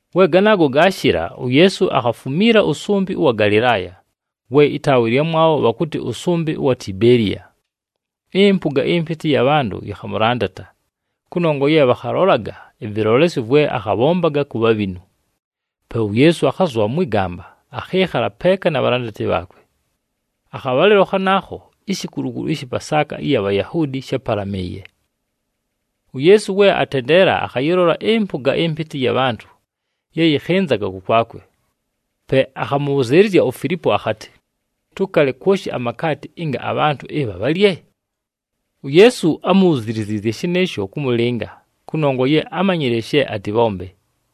We ganaago gaashɨla, uYeesu akhafumiila ʉsʉmbɨ ʉwa Galɨlaaya, we ɨtaawa ɨlyamwabho bhakʉtɨ ʉsʉmbɨ ʉwa Tibeeliya. Ɨmpʉga ɨmpɨtɨ ɨya bhantʉ yɨkhamʉlandata, kʉnongwa ye bhakhalolaga ɨvɨlolesyo vwe akhabhombaga ku bhabhinu. Pe uYeesu akhazʉbha mwɨ gamba, akhɨɨkhala peeka na bhalandati bhaakwe. Akhabhalɨlo khanaakho, ishikulukulu ɨshɨ Pasaaka ɨya Bhayahuudi shápalamɨɨye. UYeesu we atendeela, akhayɨlola ɨmpʉga ɨmpɨtɨ ɨya bhantʉ ye yɨkhɨnzaga kʉkwakwe. Pe akhamʉbhʉzɨɨlɨzya uFilipo akhatɨ, “Tʉkale kwoshi amakaati ɨnga abhantʉ ɨbha bhalye?” UYeesu ámubhuziliziizye shɨnɨɨsho kʉmʉlɨnga, kʉnongwa ye ámanyile she atɨbhombe.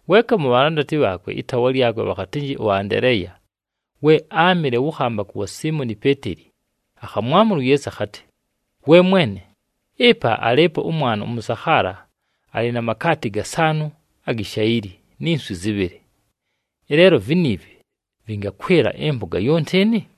Weeka mu bhalandati bhaakwe ɨtaawa lyakwe bhakhatɨnjɨ ʉAndeleeya, we áamɨle wʉ khambakʉ wa Siimoni Peeteli, akhamwamʉla uYeesu akhatɨ, “We Mwene, ɨpa alɨɨpo ʉmwana ʉmʉsakhaala alɨ na makaati gasaanʉ agi shayili ni nswi zɨbhɨlɨ. Ɨleelo viniivi vɨngakwɨla ɨmpʉga yonti ɨnɨ?”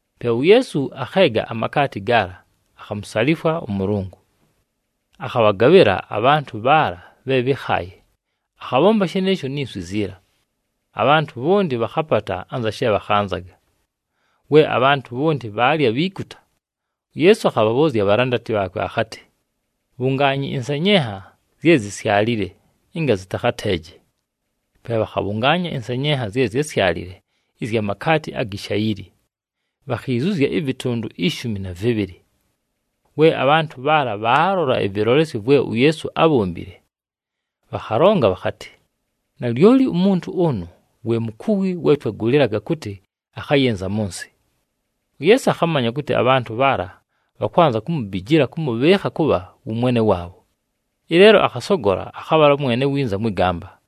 Pe uYeesu akheega amakaati gaala, akhamusalifwa ʉMʉlʉngʉ. Akhabhagabhɨla abhantʉ bhaala bhe bhɨ́khaaye, akhabhomba shɨnɨɨsho ni nswi ziila. Abhantʉ bhonti bhakhapata anza she bhakhanzaga. We abhantʉ bhonti bhaalya bhiikuta, uYeesu akhabhabhʉʉzya abhalandati bhaakwe akhatɨ, “Bhungaanyi ɨnsenyenha zye zisyalile, ɨnga zɨtakhateeje.” Pe bhakhabhʉngaanya ɨnsenyenha zye zyásyalile ɨzya makaati agi shayili, bhakhiizuzya ɨvɨtʉndʉ ishumi na vɨbhɨlɨ. We abhantʉ bhaala bhaalola ɨvɨlolesyo vwe uYeesu ábhombile, bhakhalonga bhakhatɨ, “Nalyoli umuntu ʉnʉ we mukuwi we twagʉlɨlaga kʉtɨ akhayɨnza mʉ nsɨ.” UYeesu akhamanya kʉtɨ abhantʉ bhaala bhakwanza kumubijila kʉmʉbhɨɨkha kʉbha wʉ Mwene waabho, ɨleelo akhasogola akhabhala mwene winza mwɨ gamba.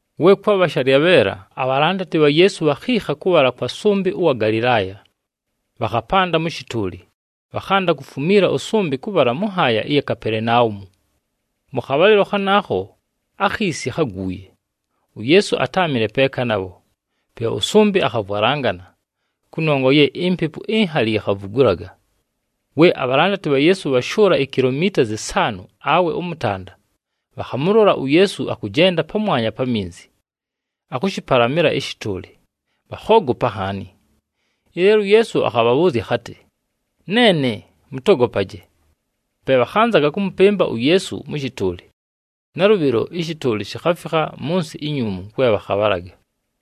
We kwabha shalyabheela, abhalandati bha Yeesu bhakhiikha kʉbhala kwa sʉmbɨ ʉwa Galɨlaaya. Bhakhapanda mʉ shɨtʉʉlɨ, bhakhanda kufumiila ʉsʉmbɨ kʉbhala mʉ nhaaya ɨya mu Kapelenaumu. Mʉ khabhalɨlo khanaakho, akhiisi kháguuye, uYeesu atáamɨle peeka nabho. Pe ʉsʉmbɨ akhavwalangana, kʉnongwa ye impepu inhali yikhavugulaga. We abhalandati bha Yeesu bhashʉʉla ikilomiita zɨsaanʉ awe ʉmʉtanda, bhakhamʉlola uYeesu akʉjenda pamwanya pa minzi, akʉshɨpalamɨla ɨshɨtʉʉlɨ, bhakhoogopa nhaani. Ɨleelo uYeesu akhabhabhʉʉzya akhatɨ, “Neene, mʉtogopaje!” Pe bhakhanzaga kʉmʉpɨmba uYeesu mʉ shɨtʉʉlɨ. Nalʉbhɨlo ɨshɨtʉʉlɨ shikhafikha mʉ nsɨ inyuumu kwe bhakhabhalaga.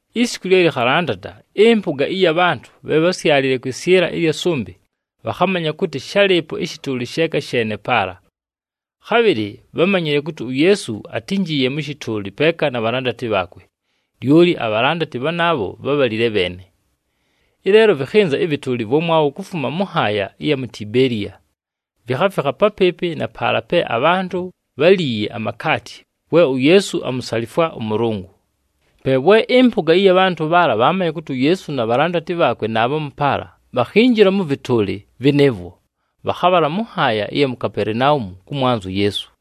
Isiku lye lɨkhalandata, ɨmpʉga ɨya bhantʉ bhe bhásyalile kwɨsyɨla ɨlya sʉmbɨ bhakhamanya kʉtɨ shálɨɨpo ɨshɨtʉʉlɨ sheeka sheene paala. Khabhɨlɨ bhámanyile kʉtɨ uYeesu atínjiiye mʉ shɨtʉʉlɨ peeka na bhalandati bhaakwe, lyoli abhalandati bhanaabho bhábhalile bheene. Ɨleelo vɨkhɨnza ɨvɨtʉʉlɨ ɨvwamwabho kufuma mʉ nhaaya ɨya mu Tibeeliya, vikhafikha papɨɨpɨ na paala pe abhantʉ bháliiye amakaati we uYeesu amusalifwa ʉMʉlʉngʉ. Pe we ɨmpʉga ɨya bhantʉ bhaala bhaamanya kʉtɨ uYeesu na bhalandati bhaakwe naabhamu paala, bhakhinjila mʉ vɨtʉʉlɨ vɨnɨɨvwo, bhakhabhala mʉ nhaaya ɨya mu Kapelenaumu kʉmwanza uYeesu.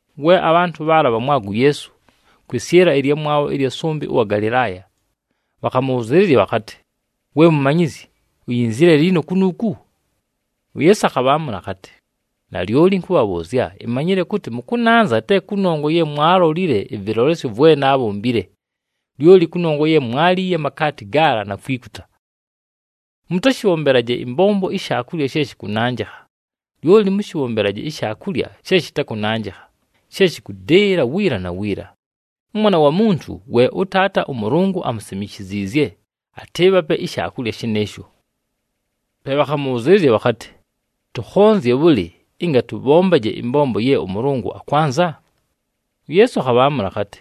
We abhantʉ bhaala bhamwaga uYeesu kwɨsyɨla ɨlyamwabho ɨlya sʉmbɨ ʉwa Galɨlaaya, bhakhamʉbhʉzɨɨlɨzya bhakhatɨ, “We Mumanyizyi, uyinzile liino kunuuku?” UYeesu akhabhaamʉla akhatɨ, “Nalyoli ɨnkʉbhabhʉʉzya, imanyile kʉtɨ mʉkʉnanza te kʉnongwa ye mwaalolile ɨvɨlolesyo vwe naabhombile, lyoli kʉnongwa ye mwaaliiye amakaati gaala na kwikuta. Mʉtashɨbhombelaje ɨmbombo ishaakulya she shɨkʉnanjɨkha, lyoli mʉshɨbhombelaje ishaakulya she shɨtakʉnanjɨkha, she shɨkʉdɨɨla wiila na wiila. ɄMwana wa Muntu we ʉTaata ʉMʉlʉngʉ amusimishiziizye, atɨɨbhape ishaakulya shɨnɨɨsho.” Pe bhakhamʉbhʉzɨɨlɨzya bhakhatɨ, “Tʉkhonzye bhʉlɨ ɨnga tʉbhombaje ɨmbombo ye ʉMʉlʉngʉ akwanza?” UYeesu akhabhaamʉla akhatɨ,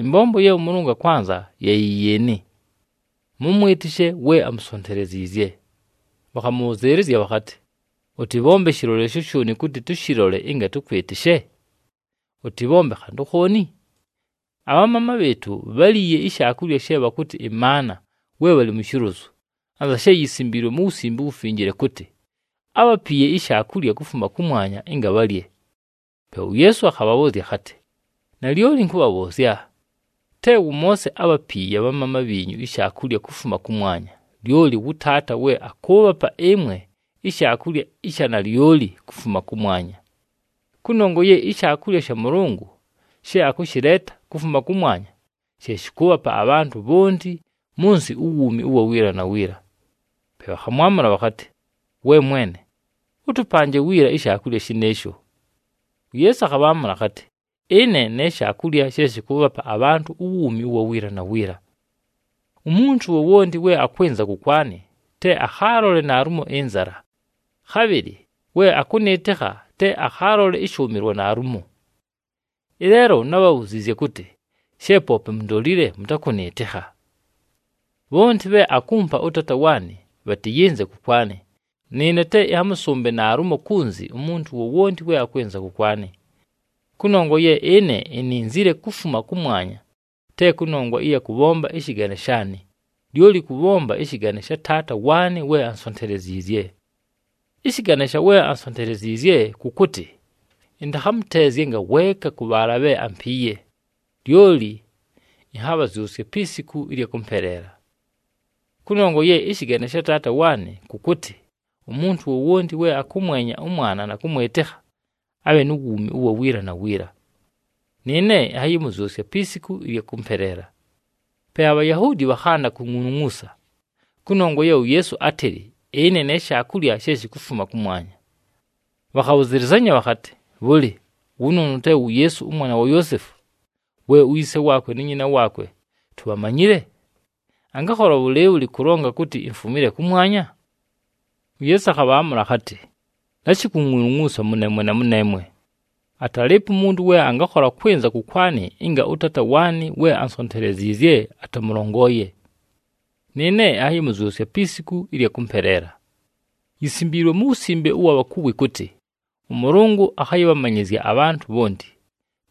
“Ɨmbombo ye ʉMʉlʉngʉ akwanza ye yɨ yɨɨnɨ: mʉmwɨtɨshe we amusonteleziizye.” Bhakhamʉbhʉzɨɨlɨzya bhakhatɨ, “Ʉtɨbhombe shɨlolesyo shooni kʉtɨ tʉshɨlole ɨnga tʉkwɨtɨshe? Ʉtɨbhombe khantʉ khooni? Abhamaama bhɨɨtʉ bháliiye ishaakulya she bhakʉtɨ ɨmaana we bhalɨ mu shilozu, anza she yisimbiilwe mu Wusimbe uWufinjile kʉtɨ, ‘Ábhapiiye ishaakulya kufuma kʉmwanya ɨnga bhalye.’” Pe uYeesu akhabhabhʉʉzya akhatɨ, “Nalyoli ɨnkʉbhabhʉʉzya, te wʉ Moose ábhapiiye abhamaama bhiinyu ishaakulya kufuma kʉmwanya, lyoli wʉ Taata we akʉʉbhapa ɨmwe ishaakulya ɨsha nalyoli kufuma kʉmwanya. Kʉnongwa ye ishaakulya sha Mʉlʉngʉ she akʉshɨleeta kufuma kʉmwanya she shɨkʉʉbhapa abhantʉ bhonti mʉ nsɨ uwuumi ʉwa wiila na wiila.” Pe bhakhamwamʉla bhakhatɨ, “We mwene, ʉtʉpanje wiila ishaakulya shɨnɨɨsho.” UYeesu akhabhaamʉla akhatɨ, “Ɨne ne shaakulya she shɨkʉʉbhapa abhantʉ uwuumi ʉwa wiila na wiila. Umuntu wowonti we akwɨnza kʉkwanɨ, te akhaalole naalumo ɨnzala, khabhɨlɨ we akʉnɨɨtɨkha te akhaalole ɨshʉʉmɨlwa naalumo. Ɨleelo nábhabhuziizye kʉtɨ she poope mundolile mʉtakʉnɨɨtɨkha. Bhonti bhe akumpa ʉTaata waanɨ, bhatɨyɨnze kʉkwanɨ, nɨɨne te ɨnhamʉsʉmbe naalumo kunzi umuntu wowonti we akwɨnza kʉkwanɨ. Kʉnongwa ye ɨne ininzile kufuma kʉmwanya te kʉnongwa ɨya kʉbhomba ɨshɨgane shaanɨ, lyoli kʉbhomba ɨshɨgane sha Taata waanɨ we ansonteleziizye. Ɨshɨgane sha we ansonteleziizye, kʉ kʉtɨ ɨntakhamʉteezye ngaweeka mʉ bhaala bhe ampiiye, lyoli ɨnhabhazyʉsye pi siku ɨlya kʉmpeleela. Kʉnongwa ye ɨshɨgane sha Taata waanɨ kʉ kʉtɨ umuntu wowonti we akʉmwenya ʉMwana na kʉmwɨtɨkha, abhe nu wuumi ʉwa wiila na wiila. Nɨɨne ɨnhayɨmʉzyʉsya pi siku ɨlya kʉmpeleela.” Pe aBhayahuudi bhakhanda kungʼulungʼuusa kʉnongwa ye uYeesu átɨlɨ, “Ɨne ne shaakulya she shikufuma kʉmwanya.” Bhakhabhʉzɨlɨzanya bhakhatɨ, “Bhʉlɨ, wʉnʉʉnʉ te wu Yeesu, ʉmwana wa Yoosefu, we uyise waakwe nu nyina waakwe tubhamanyile? Angakhola bhʉlɨɨbhʉlɨ kʉlonga kʉtɨ, ‘Imfumile kʉmwanya’?” UYeesu akhabhaamʉla akhatɨ, “Lashi kungʼulungʼuusa mʉneemwe na mʉneemwe. Atalɨɨpo umuntu we angakhola kwɨnza kʉkwanɨ ɨnga ʉTaata waanɨ we ansonteleziizye atamʉlongooye. Nɨɨne ɨnhayɨmʉzyʉsya pi siku ɨlya kʉmpeleela. Yisimbiilwe mu wusimbe ʉwa bhakuwi kʉtɨ, ‘ɄMʉlʉngʉ akhayɨbhamanyɨzya abhantʉ bhonti.’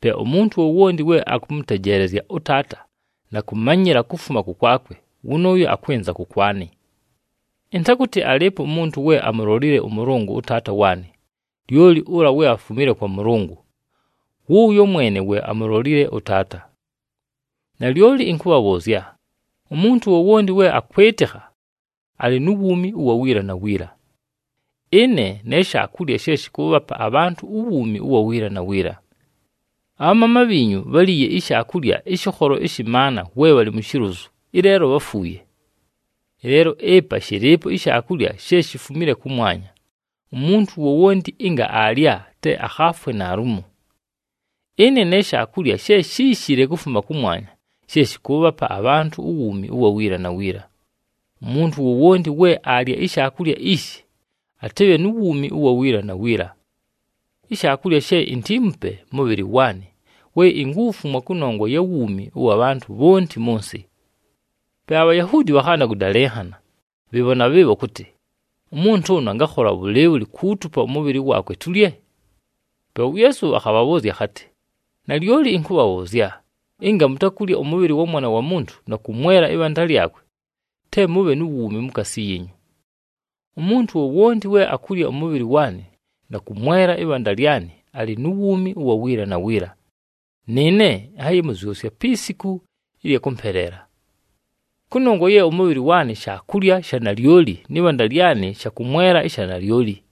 Pe umuntu wowonti we akʉmʉtejeelezya ʉTaata na kʉmanyɨla kufuma kʉkwakwe, wʉnʉʉyo akwɨnza kʉkwanɨ. Ɨntakʉtɨ alɨɨpo umuntu we amulolile ʉMʉlʉngʉ ʉTaata waanɨ, lyoli ʉla we afumile kwa Mʉlʉngʉ, wʉʉyo mwene we amulolile ʉTaata. “Nalyoli ɨnkʉbhabhʉʉzya, umuntu wowonti we akwɨtɨkha, alɨ nu wuumi ʉwa wiila na wiila. Ɨne ne shaakulya she shɨkʉʉbhapa abhantʉ uwuumi ʉwa wiila na wiila. Abhamaama bhiinyu bháliiye ishaakulya ɨshɨkholo ɨshɨ maana we bhalɨ mu shilozu, ɨleelo bháfuuye. Ɨleelo ɨpa shɨlɨɨpo ishaakulya she shifumile kʉmwanya. Umuntu wowonti ɨnga aalya te akhaafwe naalumo. Ɨne ne shaakulya she shíishile kufuma kʉmwanya she shɨkʉʉbhapa abhantʉ uwuumi ʉwa wiila na wiila. Umuntu wowonti we aalya ishaakulya ishi, atɨbhe nu wuumi ʉwa wiila na wiila. Ishaakulya she intiimupe mʉbhɨlɨ waanɨ we inkuwufumwa kʉnongwa ya wuumi ʉwa bhantʉ bhonti mʉ nsɨ.” Pe aBhayahuudi bhakhanda kʉdalɨnhana bhɨɨbho na bhɨɨbho kʉtɨ, “Umuntu ʉnʉ angakhola bhʉlɨɨbhʉlɨ kuutupa ʉmʉbhɨlɨ waakwe tulye?” Pe uYeesu akhabhabhʉʉzya akhatɨ, “Nalyoli ɨnkʉbhabhʉʉzya, ɨnga mutakulya ʉmʉbhɨlɨ wa Mwana wa Muntu na kʉmwela ɨbhanda lyakwe, te mʉbhe nu wuumi mukaasi yiinyu. Umuntu wowonti we akulya ʉmʉbhɨlɨ waanɨ na kʉmwela ɨbhanda lyanɨ alɨ nu wuumi ʉwa wiila na wiila, nɨɨne ɨnhayɨmʉzyʉsya pi siku ɨlya kʉmpeleela. Kʉnongwa ye ʉmʉbhɨlɨ waanɨ shaakulya sha nalyoli nɨ bhanda lyanɨ shakʉmwela ɨsha nalyoli.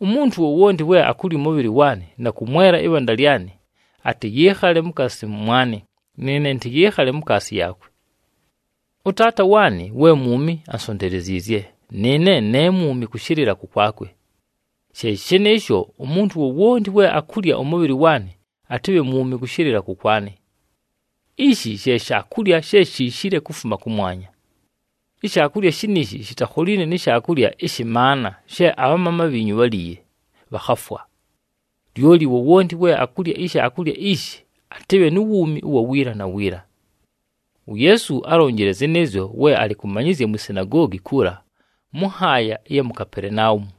Umuntu wowonti we akulya ʉmʉbhɨlɨ waanɨ na kʉmwela ɨbhanda lyanɨ, atɨyɨɨkhale mukaasi mʉmwanɨ, nɨɨne ɨntɨyɨɨkhale mukaasi yaakwe. “ɄTaata waanɨ we mwumi ansonteleziizye, nɨɨne ne mwumi kʉshɨlɨla kʉkwakwe. She shɨnɨɨsho, umuntu wowonti we akulya ʉmʉbhɨlɨ waanɨ, atɨbhe mwumi kʉshɨlɨla kʉkwanɨ. Ishi she shaakulya she shiishile kufuma kʉmwanya. Ishaakulya shiniishi shitakholiine ni shaakulya ɨshɨ maana she abhamaama bhiinyu bháliiye, bhakhafwa. Lyoli wowonti we akulya ishaakulya ishi, atɨbhe nu wuumi ʉwa wiila na wiila.” UYeesu álonjile zɨnɨɨzyo we alɨ kʉmanyɨzya mwi sinagoogi kuula mʉ nhaaya ɨya mu Kapelenaumu.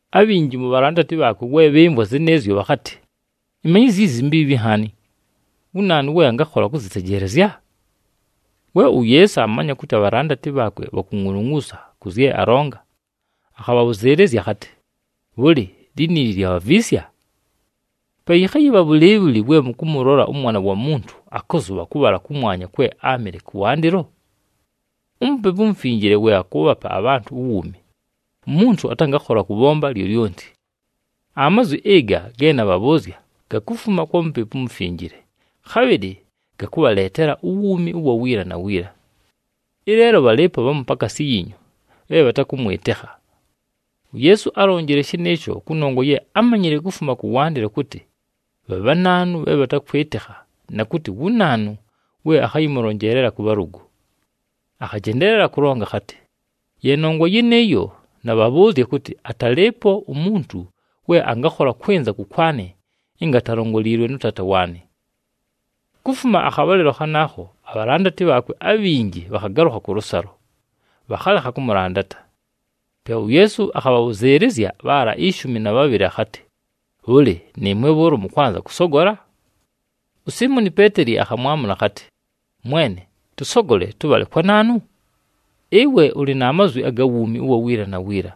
Abhinji mu bhalandati bhaakwe we bhɨmvwa zɨnɨɨzyo bhakhatɨ, “Ɨmanyɨzyo izi mbiibhi nhaani! Wu naanu we angakhola kʉzɨtejeelezya?” We uYeesu aamanya kʉtɨ abhalandati bhaakwe bhakungʼulungʼuusa kʉ zye alonga, akhabhabhʉzɨɨlɨzya akhatɨ, “Bhʉlɨ, liniili lyabhaviisya? Pe yɨkhayɨbha bhʉlɨɨbhʉlɨ we mʉkʉmʉlola ʉMwana wa Muntu akʉzʉbha kʉbhala kʉmwanya kwe áamɨle kʉwandɨlo? UMupepu uMufinjile we akʉʉbhapa abhantʉ uwuumi, umuntu atangakhola kʉbhomba lyolyonti. Amazwi ɨga ge nabhabhʉʉzya gakufuma kwa Mupepu uMufinjile, khabhɨlɨ gakʉbhaleetela uwuumi ʉwa wiila na wiila. Ɨleelo bhalɨɨpo bhamu pakaasi yiinyu bhe bhatakʉmwɨtɨkha.” UYeesu álonjile shɨnɨɨsho kʉnongwa ye ámanyile kufuma kʉwandɨlo kʉtɨ bha bhanaanu bhe bhatakwɨtɨkha na kʉtɨ wu naanu we akhayɨmʉlonjeelela kʉ bhalʉgʉ. Akhajendeelela kʉlonga akhatɨ, “Ye nongwa yɨnɨɨyo, nabhabhʉʉzya kʉtɨ atalɨɨpo umuntu we angakhola kwɨnza kʉkwanɨ ɨnga atalongoliilwe nʉ Taata waanɨ.” Kufuma akhabhalɨlo khanaakho abhalandati bhaakwe abhinji bhakhagalʉkha kʉlʉsalo, bhakhalekha kʉmʉlandata. Pe uYeesu akhabhabhʉzɨɨlɨzya bhaala ishumi na bhabhɨlɨ akhatɨ, “Bhʉlɨ, nɨɨmwe bhʉʉlo mʉkwanza kʉsogola?” USiimoni Peeteli akhamwamʉla akhatɨ, “Mwene, tʉsogole tʉbhale kwa naanu? Ɨwe ʉlɨ na mazwi aga wuumi ʉwa wiila na wiila.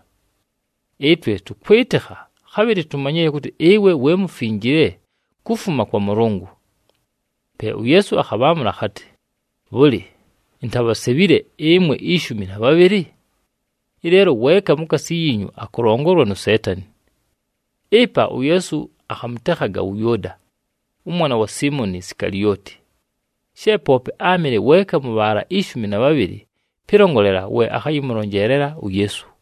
Ɨtwe tʉkwɨtɨkha, khabhɨlɨ tumanyile kʉtɨ ɨwe we Mufinjile kufuma kwa Mʉlʉngʉ.” Pe uYeesu akhabhaamʉla akhatɨ, “Bhʉlɨ, intabhasebhile ɨmwe ishumi na bhabhɨlɨ? Ɨleelo weeka mukaasi yiinyu akʉlongolwa nu Seetani.” Ɨpa uYeesu akhamʉtekhaga wʉ Yʉʉda, ʉmwana wa Siimoni Sikalioti. She poope áamɨle weeka mʉ bhaala ishumi na bhabhɨlɨ, pɨlongolela we akhayɨmʉlonjeelela uYeesu.